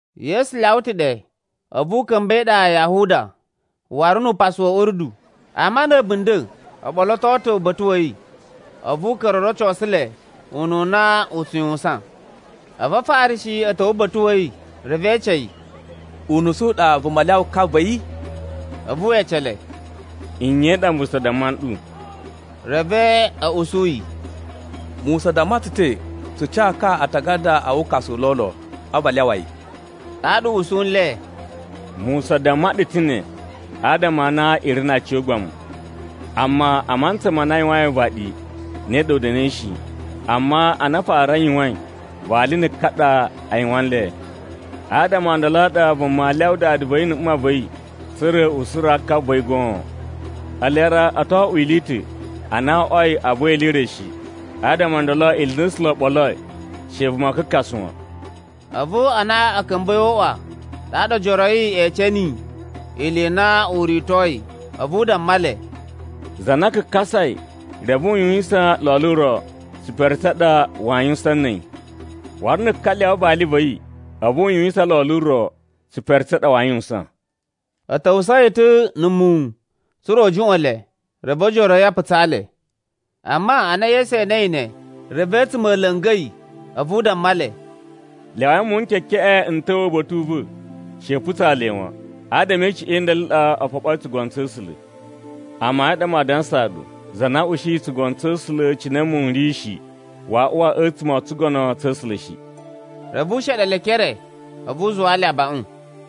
Yesu lyawa ta̱ ɗe, a̱vu u ka̱mba̱ e iɗa ya Yahuda, waru nu upasu wa̱ Urdu, ama na̱ a̱bunda̱ o ɓoloto ta̱ uba̱ta̱ wa̱ yi, a̱vu u ka̱ra̱ o rocosu le ununa u tsu yuwusan. A̱vu Afarishi a̱ ta̱wa̱ uba̱ta̱ wa̱ yi, reve e ece yi, “Unusu u ɗa vuma lyawa ka va̱ yi?” A̱vu we ece le, “Nye i ɗa Musa damma nɗu?” Reve a̱ usu yi, “Musa damma tsu ta̱ tsu ca ka aatagada a wukasu u lolo, a̱vu a lyawa yi.” Ɗaɗa u usu nle, “Musa damma ɗu ta̱ ne, adama a na i ri na aciyogbamu. Amma a mantsa ma na a yuwain uvaɗi ne ɗa u da̱na̱i shi. Amma ana a fara a yuwain, ‘vali na̱ ka ɗa a yuwan nle.’ ‘Adama o ndolo a ɗa vuma aa lyawa dada va̱ yi na̱ mma va̱ yi, tsa̱ra̱ u suraa ka va̱ yi goon. Ele ra o to oꞌwo ili i ta̱.’ Ana wo oꞌwoi a buwa ili i re shi, adama o ndolo ili i na A̱sula̱ o ɓoloi, she vuma kakasa wan.” A̱vu ana a̱ ka̱mba̱i o uꞌwa ɗaɗa ojoro a̱ yi e ece niyi ili i na u ritoi. A̱vu u damma le, “Za na kakasai, reve u yuwisan lolo ro, tsipere tsa ɗa waa yuwusan na̱ a̱yi. Waru na̱ ka lyawa vali va̱ yi, a̱vu u yuwisan lolo ro, tsipere tsa ɗa waa yuwusan.” A̱ ta̱wusa̱a̱ yi ta̱ na̱ muwun, tsa̱ra̱ u juꞌwa̱n le. Reve ojoro a̱ yi a putsa le. Amma ana Yesu enei ne, reve a̱tsuma̱ a̱ la̱nga̱ yi. A̱vu u damma le, “Lyawai muwun n kekeꞌen n ta̱wa̱ uba̱ta̱ u va̱, she i putsa le wan. Adama e icuꞌun i ndolo i ɗa o foɓoi tsugono tsa̱ A̱sula̱. “Amayun a ɗa maa dansaa ɗu, za na usuyi tsugono tsa̱ A̱sula̱ cine muwun n ri shi, waa uwa a̱tsuma̱ o tsugono tsa̱ A̱sula̱ shi.” Reve u sheɗe le e ekere, a̱vu u zuwaa le abaꞌun.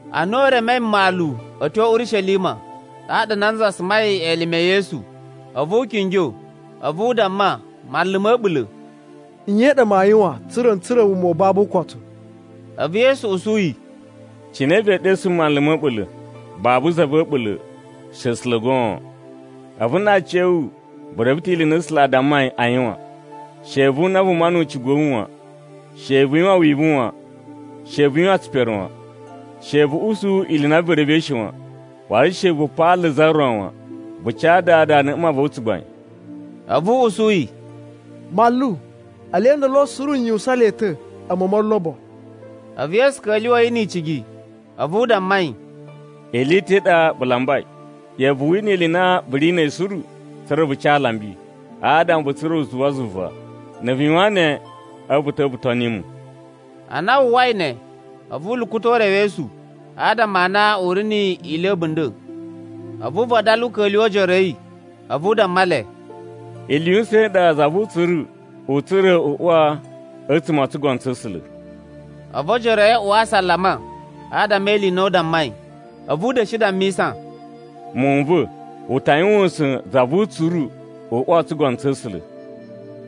Ana u remei mmalu a̱ tyo Urishelima, ɗaɗa nanza sumai elime e Yesu, a̱vu u kingyo. A̱vu u damma, manlu ma̱ a̱ɓula̱, “Nye ɗa maa yuwan, tsa̱ra̱ n tsura̱ wuma u babu ukotu?” A̱vu Yesu usu yi, “Cine vee ɗesu mu manlu ma̱ a̱ɓula̱? Babu za va̱ a̱ɓula̱, she A̱sula̱ goon. A̱vu na aciya̱wu vu reve ta̱ ili i na A̱sula̱ a dammai a yuwan: ‘She vu una vuma nu ucigu wa̱ wu wan, she vu yuwan wivu wan, she vu yuwan tsipere wan. She vu usu ili i na vu revei shi wan, waru she vu paala za ro wan. Vu ca dada na̱ mma va̱ wu tsugbain.’” A̱vu u usu yi, “Manlu, ele ndolo suru n yuwusan le ta̱, a̱mu o molobo.” A̱vu Yesu ka̱lyuwa̱ yi ni icigi. A̱vu u damma yi, “Ili i ta̱ i ɗa vu lambai, ꞌya̱wa̱ vu wina ili i na vu ri na̱ a̱yi suru, tsa̱ra̱ vu ca alambi, adama vu tsura̱ uzuwa zuva. Na̱ vu yuwan ne a̱vu vu ta̱wa̱ vu toni mu.” Ana wu uwwai ne, a̱vu u lukuta̱ urewesu, adama a na u ri ni ili a̱bunda̱. A̱vu u vadala u ka̱lyuwa̱ ojoro a̱ yi, a̱vu u damma le, “Ili yu usa̱n i ɗa za vu utsuru u tsura̱ u uwa a̱tsuma̱ o tsugono tsa̱ A̱sula̱.” A̱vu ojoro a̱ yi a uwa asalama, adama e ili i na u dammai. A̱vu u da̱shi dammisa, “Muwun n va̱, u ta yuwan usa̱n za vu utsuru uwa o tsugono tsa̱ A̱sula̱.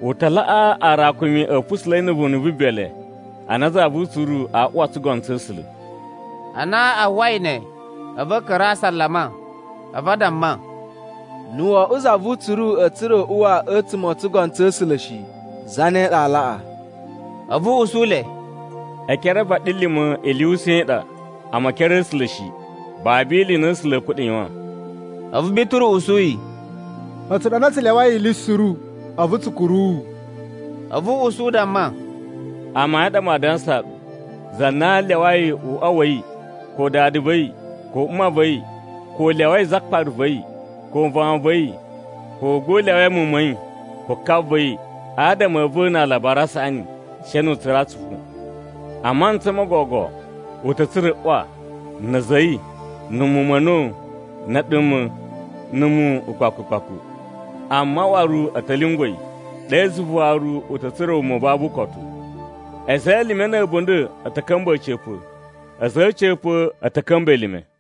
U ta laꞌaa aarakumi a̱ pusula̱i na̱ vunu vu bele, ana za vu utsuru aa uwa o tsugono tsa̱ A̱sula̱.” Ana a uwwai ne, a̱vu a̱ ka̱ra̱ a asalama, a̱vu a damma, “Na̱ wo oꞌwo za vu utsuru a̱a̱ tsura̱ u uwa a̱tsuma̱ o tsugono tsa̱ A̱sula̱ shi, zane ɗa aa laꞌa?” A̱vu u usu le, “E ekere a vaɗilima̱ ili yu usa̱n i ɗa, amma e ekere a̱ A̱sula̱ shi. Babu ili i na A̱sula̱ a̱a̱ kuɗa̱ yuwan.” A̱vu Bituru usu yi, “A̱tsu ɗa nda tsu lyawai ili suru, a̱vu tsu kuru wu.” A̱vu u usu u damma, “Amayun a ɗa maa dansaa ɗu, za na lyawai uꞌwa wa̱ yi, ko dada va̱ yi, ko mma va̱ yi, ko u lyawai zakpara va̱ yi, ko vawun va̱ yi, ko gba u lyawai muwun ma̱ yi, ko ka va̱ yi, adama a̱ va̱ na Alabari a Saꞌani, she nu u tsura̱ atsupu. A mantsa mo gogo, u ta̱ tsura̱ ꞌwa, na̱ a̱za̱ a̱ yi, na̱ muwun ma̱ a̱na̱wu, na̱ a̱ɗuma̱, na̱ muwun, ukpaku ukpaku. Amma waru a̱ ta̱ lyungwa̱ yi. Ɗe zuva waru u ta̱ tsura̱ wuma u babu ukotu. A̱za̱ e elime na̱ a̱bunda̱ a̱ ta̱ ka̱mba̱ a̱ca̱pa̱. A̱za̱ a̱ a̱ca̱pa̱ a̱ ta̱ ka̱mba̱ elime.”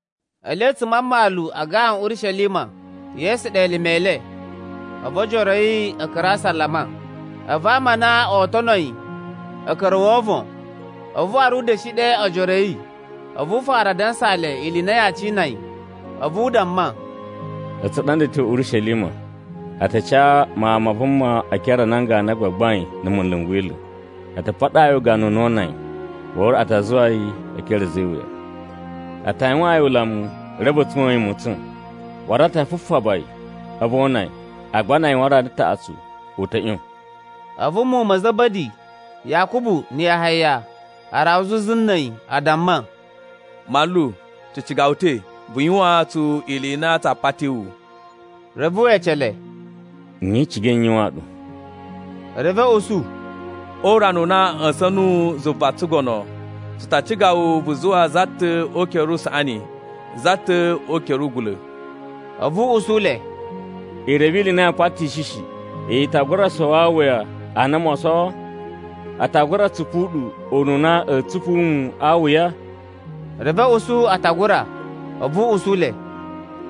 Ele a̱tsuma̱ a mmalu a gawan Urishelima, Yesu ɗe elime e le, a̱vu ojoro yi ka̱ra̱ asalama. A̱vu ama a na oo tono yi, a̱ ka̱ra̱ o wovon. A̱vu waru u da̱shi ɗe ojoro a̱ yi, a̱vu u fara a dansaa le ili i na yaa cina yi. A̱vu u damma, “A̱tsu ɗa nda a̱ tyo Urishelima, a ta ca Mawun ma Vuma e ekere a nan ganu a gbagbain na̱ munlu n Wila̱. A ta paɗaa yi ugana u na oo una yi, waru a ta zuwa yi e ekere a̱ a̱za̱ e iwuya. A ta yuwaan yi ulamu reve a̱ tsuwa̱n yi ma̱tsa̱n. Waru a ta fufaba yi, a̱vu o una yi. Agba na a yuwan rana taꞌatsu, u ta̱ ꞌyon.” A̱vu muwun ma̱ Za̱ba̱di, Yakubu na̱ Yahaya, a rawa zuzu na̱ a̱yi a damma, “Manlu tsu ciga wu ta̱, vu yuwaan tsu ili i na tsaa pati wu.” Reve we ece le, “Nye i cigai n yuwaan ɗu?” Reve a̱ usu, “Urana u na a̱ ꞌya̱sa̱n nuwu zuva na̱ tsugono, tsu ta ciga wu vu zuwa za ta̱ o ukere usaꞌani, za ta̱ o ukere ugula̱.” A̱vu u usu le, “I reve ili i na yaa patishi shi. I ta gura sowo awuya a na moo sowo, a ta gura tsupu ɗu ununa a̱a̱ tsupu mu a awuya?” Reve a̱ usu a ta gura. A̱vu u usu le,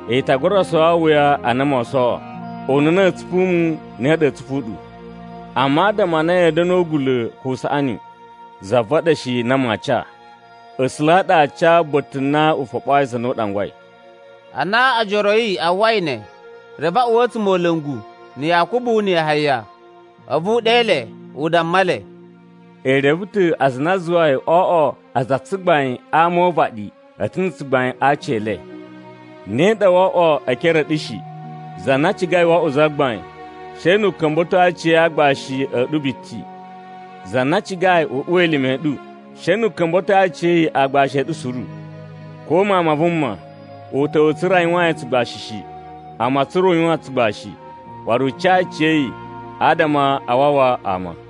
“I ta gura sowo awuya a na moo sowo, ununa a̱a̱ tsupu mu ne ɗa a̱a̱ tsupu ɗu. Amma adama a na ya̱a̱ da̱nu o ugula̱ ko o usaꞌani, za va̱ ɗa shi na maa ca. A̱sula̱ a ɗa aa ca ba̱ta̱ na u foɓoyi aza a na a ɗangwai.” Ana ojoro a̱ yi a uwwai ne, reve a uwa a̱tsumola̱ngu na̱ Yakubu na̱ Yahaya. A̱vu u ɗe le, u damma le, “I reve ta̱ aza a na a zuwai o oꞌwo aza a tsugbain a ama o uvaɗi, a̱ ta̱ na̱ tsugbain a aci e le. Ne ɗa woo oꞌwo e ekere a̱ ɗu shi. Za na cigai wo oꞌwo zagbain, she nu u ka̱mba̱to aciya̱yi aagbashi a̱ ɗu biti. Za na cigai u uwa elime a̱ ɗu, she nu u ka̱mba̱to aciya̱yi aagbashi a̱ ɗu suru. Ko Mawun ma Vuma, u ta̱wa̱ tsa̱ra̱ a yuwaan yi tsugbashi shi. Amma tsa̱ra̱ u yuwan tsugbashi, waru u ca aciya̱yi, adama a wawa ama.”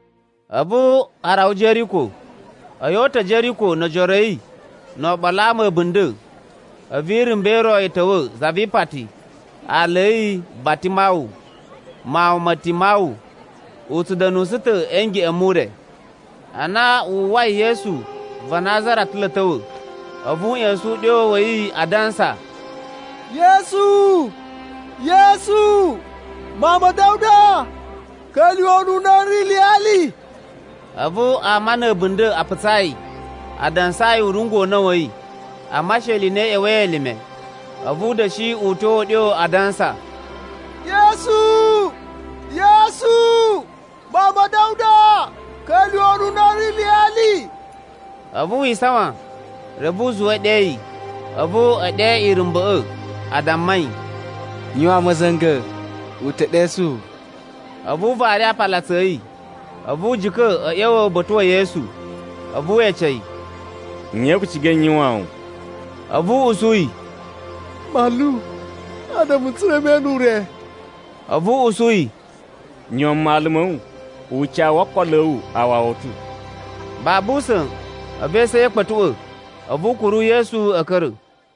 A̱vu a rawa Jeriko. A̱yi o uta̱ Jeriko no ojoro a̱ yi no oɓolo a ama a̱bunda̱, a̱vu irumba̱ i ro i ta̱wa̱ zavipati aala a̱ yi Bartimawu, mawun ma Timawu. U tsu da̱nusu ta̱ a̱ ngeꞌen mu ure. Ana wu uwwai Yesu va Nazara ta̱ lo a̱ ta̱wa̱, a̱vu u ꞌya̱sa̱n uɗyo wa̱ yi a dansa, “Yesu, Yesu, mawun ma̱ Da̱wuda, ka̱lyuwa̱ ununa n ri iliyali.” A̱vu ama na̱ a̱bunda̱ a putsa yi, a dansaa yi u rungwa̱ una̱ wa̱ yi. Amma she ili i na i ꞌya̱wa̱i elime, a̱vu u da̱shi uta̱a̱ uɗyo a dansa, “Yesu, Yesu, mawun ma̱ Da̱wuda, ka̱lyuwa̱ ununa n ri iliyali.” A̱vu wi isawan, reve u zuwa e ɗe yi. A̱vu e ɗe irumba̱ꞌa̱, a damma yi, “Yuwan ma̱za̱nga̱, u ta̱ ɗesu wu.” A̱vu u vari aapalutsu a̱ yi, a̱vu u jika̱ a̱ ꞌya̱wa̱ uba̱ta̱ wa̱ Yesu. A̱vu we ece yi, “Nye vu cigai n yuwaan wu?” A̱vu u usu yi, “Manlu, adama n tsura̱ me ene ure.” A̱vu u usu yi, “Yuwan mmalu ma̱ wu, ucawu wo okolo a̱ wu u wawa wu ta̱.” Babu usa̱n, a̱vu esu a̱ yi a̱ kpa̱tuꞌwa̱, a̱vu u kuru Yesu a̱ ka̱ra̱.